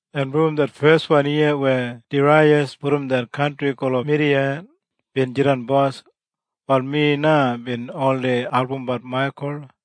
“En brom det feswan yiya wen Daraiyas brom det kantri gulum Midiya, bin jidan bos, wal mi na bin oldei albumbat Maikul.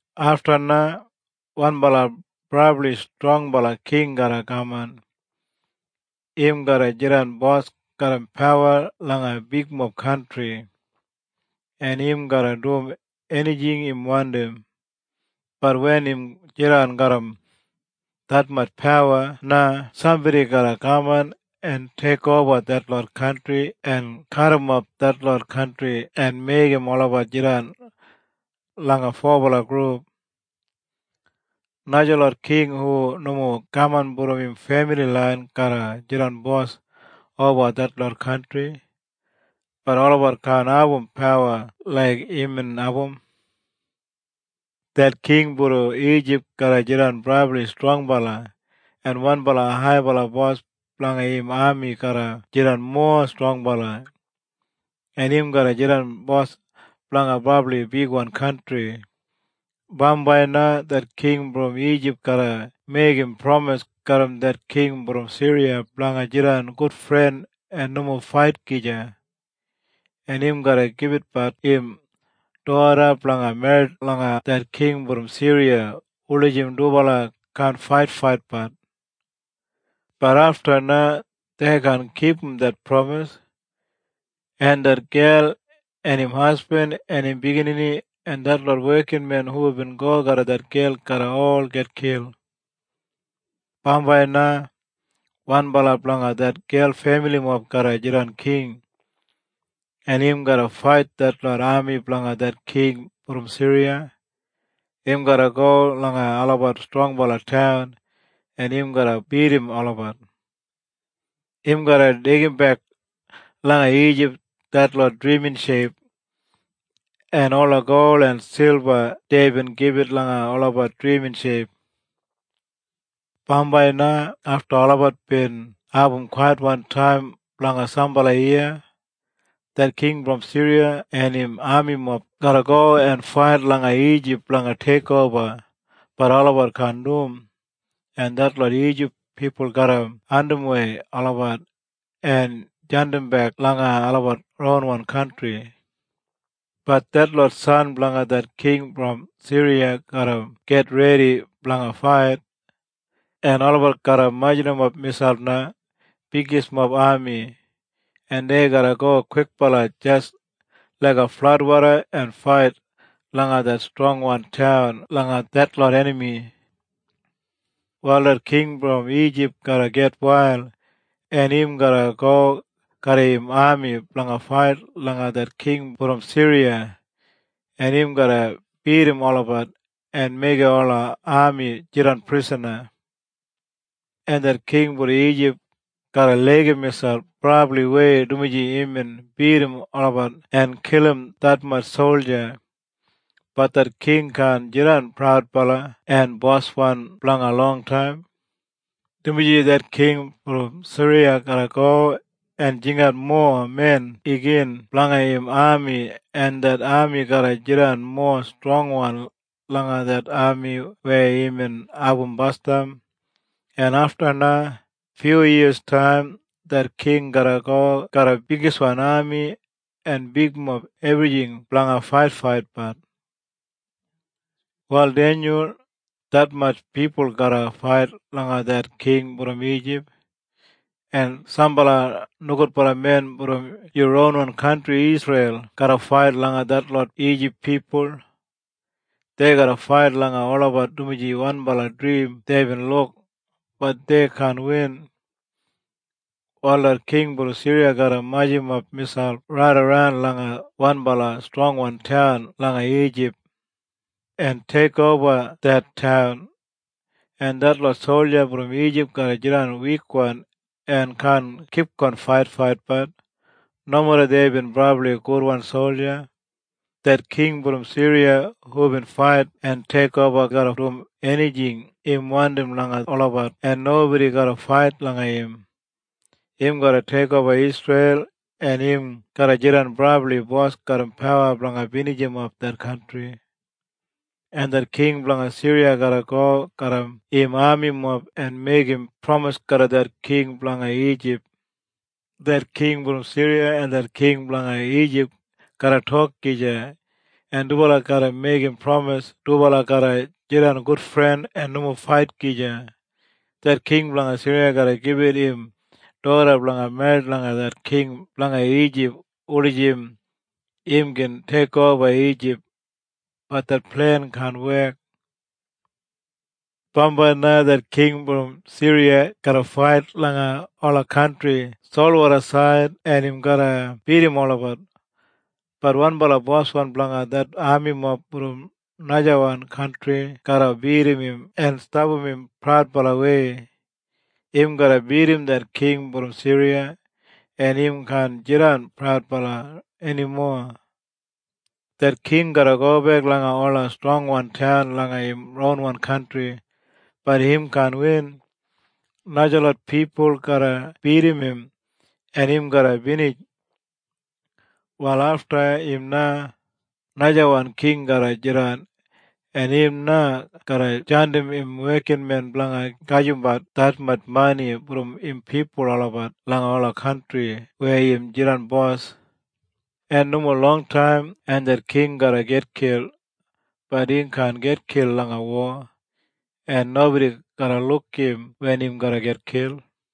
“Afta na wanbala brabli strongbala king garra kaman. Im garra jidan bos garram pawa langa bigmob kantri, en im garra dum enijing im wandim. Bat wen im jidan garram detmatj pawa na sambodi garra kaman en teikoba detlot kantri en kadimap detlot kantri en meigim olabat jidan langa fobala grup. Najalot king hu nomo kaman brom im femili lain garra jidan bos oba detlot kantri, bat olabat kaan abum pawa laik imbin abum. “Det king brom Ijip garra jidan brabli strongbala. En wanbala haibala bos blanga im ami garra jidan mowa strongbala, en im garra jidan bos blanga brabli bigwan kantri. Bambai na det king brom Ijip garra meigim pramis garram det king brom Siriya blanga jidan gudfren en nomo fait gija. En im garra gibitbat im doda blanga merrit langa det king brom Siriya wulijim dubala kaan faitfaitbat. Bat afta na dei kaan kipum det pramis, en det gel en im hasbin en im biginini en detlot wekinmen hubin go garram det gel garra ol gitkil. “Bambai na wanbala blanga det gel femilimob garra jidan king. En im garra fait detlot ami blanga det king brom Siriya. Im garra go langa olabat strongwan taun en im garra bidim olabat. Im garra deigimbek langa Ijip detlot drimin sheip, en ola gol en silba deibin gibit langa olabat drimin sheip. “Bambai na afta olabat bin abum kwaitbala taim blanga sambala yiya, det king brom Siriya en im amimob garra go en fait langa Ijip blanga teikoba, bat olabat kaan dum, en detlot Ijip pipul garra andimwei olabat en jandimbek langa olabat ronwan kantri. Bat detlot san blanga det king brom Siriya garra gitredi blanga fait, en olabat garra majurrumap miselp na bigismob ami. En dei garra go kwikbala jis laiga fladwoda en fait langa det strongwan taun langa detlot enami. “Wal det king brom Ijip garra gitwail, en im garra go garram im ami blanga fait langa det king brom Siriya en im garra bidim olabat en meigim ola ami jidan prisana. En det king brom Ijip garra laigim miselp brabliwei dumaji imbin bidim olabat en kilim detmatj solja. Bat det king kaan jidan praudbala en boswan blanga longtaim, dumaji det king brom Siriya garra go en jingat mowa men igin blanga im ami, en det ami garra jidan mowa strongwan langa det ami weya imbin abum basdam. En afta na, fyuyiyastaim, det king garra go garram bigiswan ami en bigmob ebrijing blanga faitfaitbat. “Wal Denyul, detmatj pipul garra fait langa det king brom Ijip. En sambala nogudbala men brom yu ronwan kantri Isreil garra fait langa detlot Ijip pipul. Dei garra fait langa olabat dumaji wanbala drim deibin luk, bat dei kaan win. Wal det king brom Siriya garra majurrumap miselp raidaran langa wanbala strongwan taun langa Ijip, en teikoba det taun. En detlot solja brom Ijip garra jidan wikwan en kaan kipgon faitfaitbat, nomeda deibin brabli gudwan solja. Det king brom Siriya hubin fait en teikoba garra dum enijing im wandim langa olabat en nobodi garra fait langa im. Im garra teikoba Isreil en im garra jidan brabli bos garram pawa blanga binijimap det kantri. En det king blanga Siriya garra go garram im amimob en meigim pramis garram det king blanga Ijip. Det king brom Siriya en det king blanga Ijip garra tok gija en dubala garra meigim pramis dubala garra jidan gudfren en nomo fait gija. Det king blanga Siriya garra gibit im doda blanga merrit langa det king blanga Ijip wulijim im gin teikoba Ijip, bat det plen kaan wek. “Bambai na det king brom Siriya garra fait langa ola kantri solwodasaid en im garra bidim olabat. Bat wanbala boswan blanga det amimob brom najawan kantri garra bidim im en stapam im praudbalawei. Im garra bidim det king brom Siriya, en im kaan jidan praudbala enimo. Det king garra gobek langa ola strongwan taun langa im ronwan kantri, bat im kaan win. Najalot pipul garra bidim im en im garra binij. “Wal afta im na, najawan king garra jidan, en im na garra jandim im wekinmen blanga gajimbat detmatj mani brom im pipul olabat langa ola kantri weya im jidan bos. En nomo longtaim en det king garra gitkil, bat im kaan gitkil langa wo, en nobodi garra luk im wen im garra gitkil.”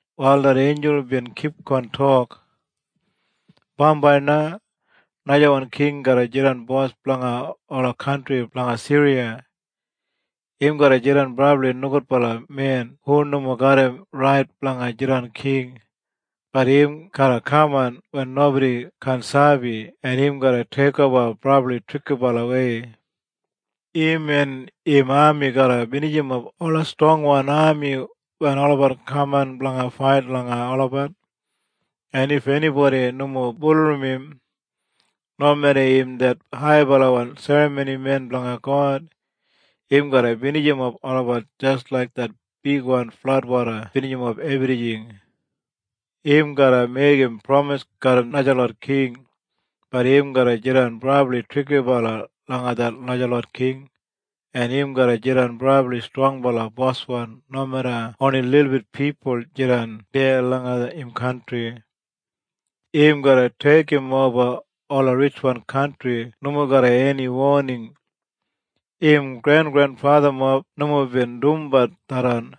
Wal det einjul bin kipgon tok, “Bambai na najawan king garra jidan bos blanga ola kantri blanga Siriya. Im garra jidan brabli nogudbala men hu nomo garram rait blanga jidan king, bat im garra kaman wen nobodi kaan sabi en im garra teikoba brabli trikibalawei. Im en im ami garra binijimap ola strongwan ami wen olabat kaman blanga fait langa olabat. En if enibodi nomo bulurrum im, nomeda im det haibala serramonimen blanga God, im garra binijimap olabat jis laik det bigwan fladwoda binijimap ebrijing. Im garra meigim pramis garram najalot king, bat im garra jidan brabli trikibala langa det najalot king, en im garra jidan brabli strongbala boswan nomeda oni lilbit pipul jidan deya langa im kantri. Im garra deigimoba ola ritjwan kantri nomo garram eni woning. Im grengrenfathamob nomo bin dumbat tharran.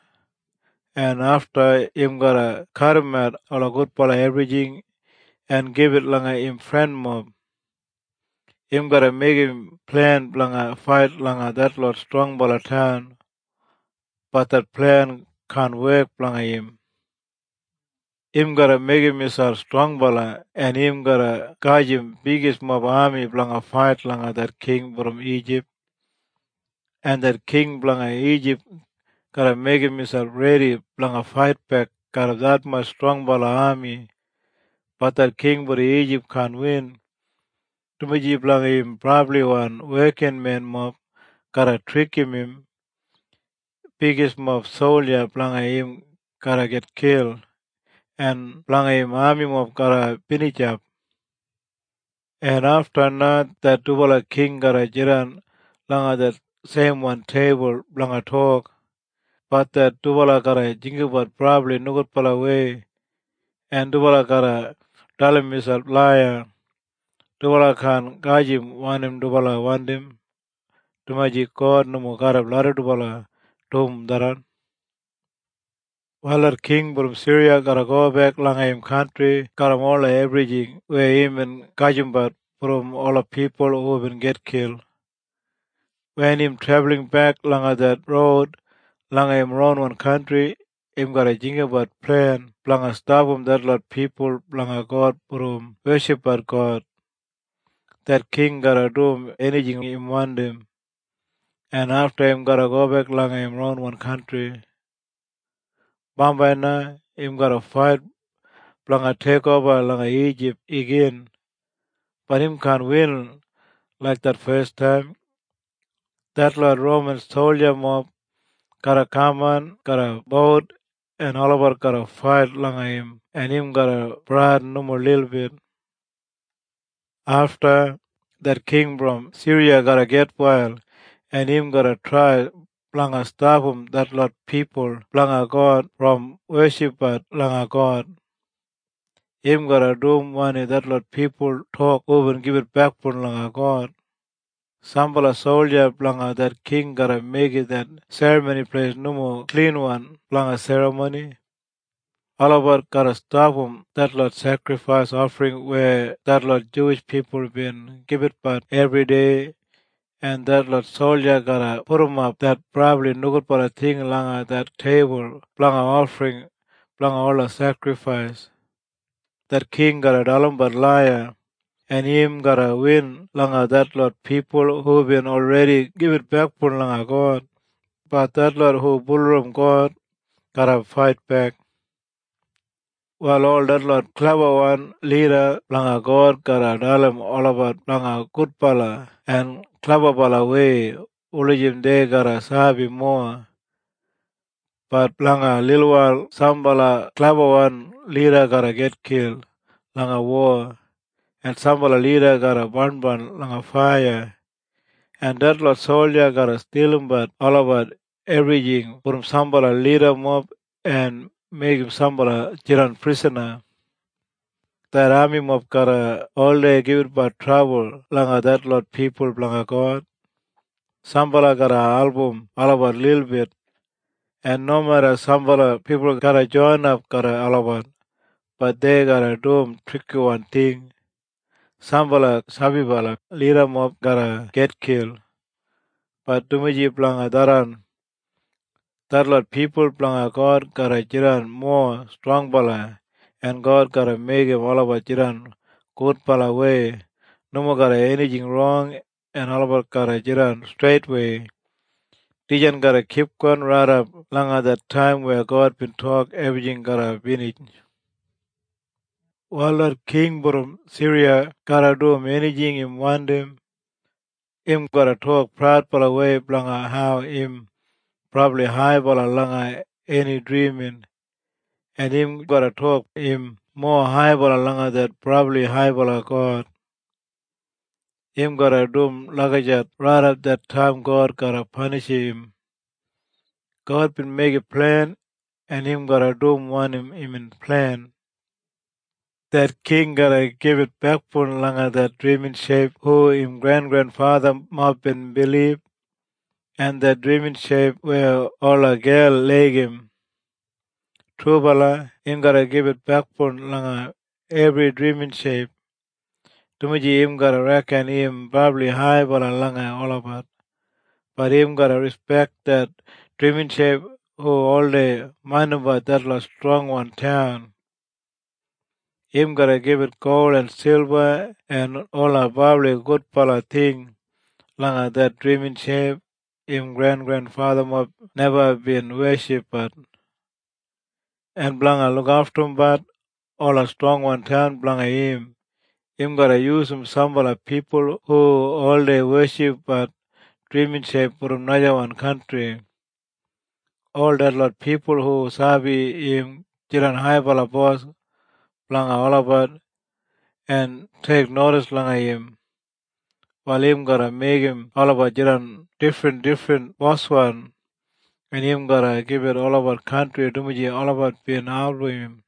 En afta im garra kadimat ola gudbala ebrijing en gibit langa im frenmob. Im garra meigim plen blanga fait langa detlot strongbala taun, bat det plen kaan wek blanga im. “Im garra meigim miselp strongbala en im garra gajim bigismob ami blanga fait langa det king brom Ijip, en det king blanga Ijip garra meigim miselp redi blanga faitbek garram detmatj strongbala ami. Bat det king brom Ijip kaan win, dumaji blanga im brabliwan wekinmenmob garra trikim im. Bigismob solja blanga im garra gitkil en blanga im amimob garra binijap. En afta na det dubala king garra jidan langa det seimwan teibul blanga tok, bat det dubala garra jinggabat brabli nogudbalawei en dubala garra dalim miselp laiya. Dubala kaan gajim wanim dubala wandim, dumaji God nomo larram dubala dum tharran. “Wal det king brom Siriya garra gobek langa im kantri garram ola ebrijing weya imbin gajimbat brom ola pipul hubin gitkil. Wen im trebulinbek langa det roud langa im ronwan kantri im garra jinggabat plen blanga stapam detlot pipul blanga God brom weshipbat God. Det king garra dum enijing im wandim, en afta im garra gobek langa im ronwan kantri. “Bambai na im garra fait blanga teikoba langa Ijip igin, bat im kaan win laik det fes taim. Detlot Roman soljamob garra kaman garram bout en olabat garra fait langa im en im garra bradin nomo lilbit. “Afta, det king brom Siriya garra gitwail en im garra trai blanga stapam detlot pipul blanga God brom weshipbat langa God. Im garra dum wanim detlot pipul tok hubin gibit bekboun langa God. Sambala solja blanga det king garra meigim det Serramoni Pleis nomo klinwan blanga serramoni. Olabat garra stapam detlot sekrifais ofring weya detlot Juwish pipul bin gibitbat ebridei, en detlot solja garra pudumap det brabli nogudbala ting langa det teibul blanga ofring blanga ola sekrifais.” Det king garra dalimbat laiya, en im garra win langa detlot pipul hubin olredi gibit bekboun langa God, bat detlot hu bulurrum God garra faitbek. “Wal ol detlot klebawan lida blanga God garra dalim olabat blanga gudbala en klebabalawei wulijim dei garra sabi mowa. Bat blanga lilwail sambala klebawan lida garra gitkil langa wo, en sambala lida garra barnbarn langa faiya, en detlot solja garra stilimbat olabat ebrijing brom sambala lidamob en meigim sambala jidan prisana. Det amimob garra oldei gibitbat trabul langa detlot pipul blanga God, sambala garra album olabat lilbit, en nomeda sambala pipul garra joinap garram olabat, bat dei garra dum trikiwan ting. Sambala sabibala lidamob garra gitkil, bat dumaji blanga tharran, detlot pipul blanga God garra jidan mowa strongbala en God garra meigim olabat jidan gudbalawei nomo garram enijing rong en olabat garra jidan streitwei. Dijan garra kipgon raidap langa det taim weya God bin tok ebrijing garra binij. “Wal det king brom Siriya garra dum enijing im wandim. Im garra tok praudbalawei blanga hau im brabli haibala langa eni drimin, en im garra tok im mowa haibala langa det Brabli Haibala God. Im garra dum lagijat raidap det taim God garra panishim im. God bin meigim plen en im garra dum wanim imbin plen. Det king garra gibit bekboun langa det drimin sheip hu im grengrenfathamob bin bilib, en det drimin sheip weya ola gel laigim. Trubala im garra gibit bekboun langa ebri drimin sheip, dumaji im garra reken im brabli haibala langa olabat. Bat im garra rispek det drimin sheip hu oldei maindimbat detlot strongwan taun. Im garra gibit gol en silba en ola brabli gudbala ting langa det drimin sheip im grengrenfathamob neba bin weshipbat. En blanga lukaftumbat ola strongwan taun blanga im, im garra yusum sambala pipul hu oldei weshipbat drimin sheip brom najawan kantri. Ol detlot pipul hu sabi im jidan haibala bos blanga olabat en teiknodis langa im, wal im garra meigim olabat jidan difrindifrin boswan en im garra gibit olabat kantri dumaji olabat bin album im.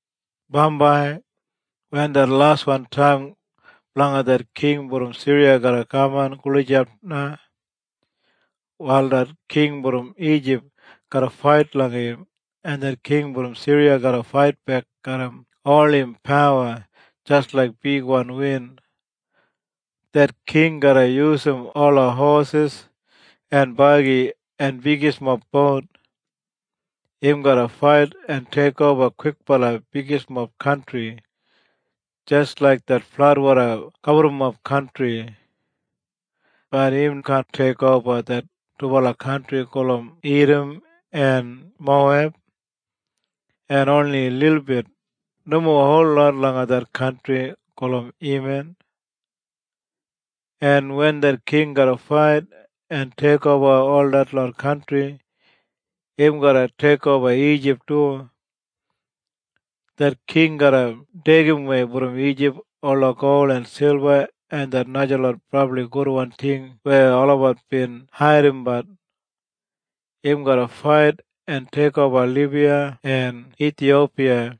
“Bambai, wen det laswan taim blanga det king brom Siriya garra kaman gulijap na, wal det king brom Ijip garra fait langa im, en det king brom Siriya garra faitbek garram ol im pawa jis laik bigwan win. Det king garra yusum ola hosis en bagi en bigismob bout. Im garra fait en teikoba kwikbala bigismob kantri, jis laik det fladwoda gaburrumap kantri. Bat im kaan teikoba det dubala kantri gulum Idam en Moweb, en oni lilbit, nomo holot langa det kantri gulum Eman. En wen det king garra fait en teikoba ol detlot kantri, im garra teikoba Ijip du. Det king garra deigimwei brom Ijip ola gol en silba en det najalot brabli gudwan ting weya olabat bin haidimbat. Im garra fait en teikoba Libiya en Ithiyopiya.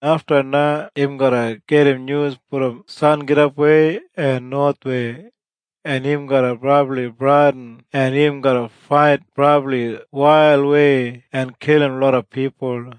“Afta na im garra gedim nyus brom sangidapwei en nowathwei, en im garra brabli bradin en im garra fait brabli wailwei en kilim loda pipul.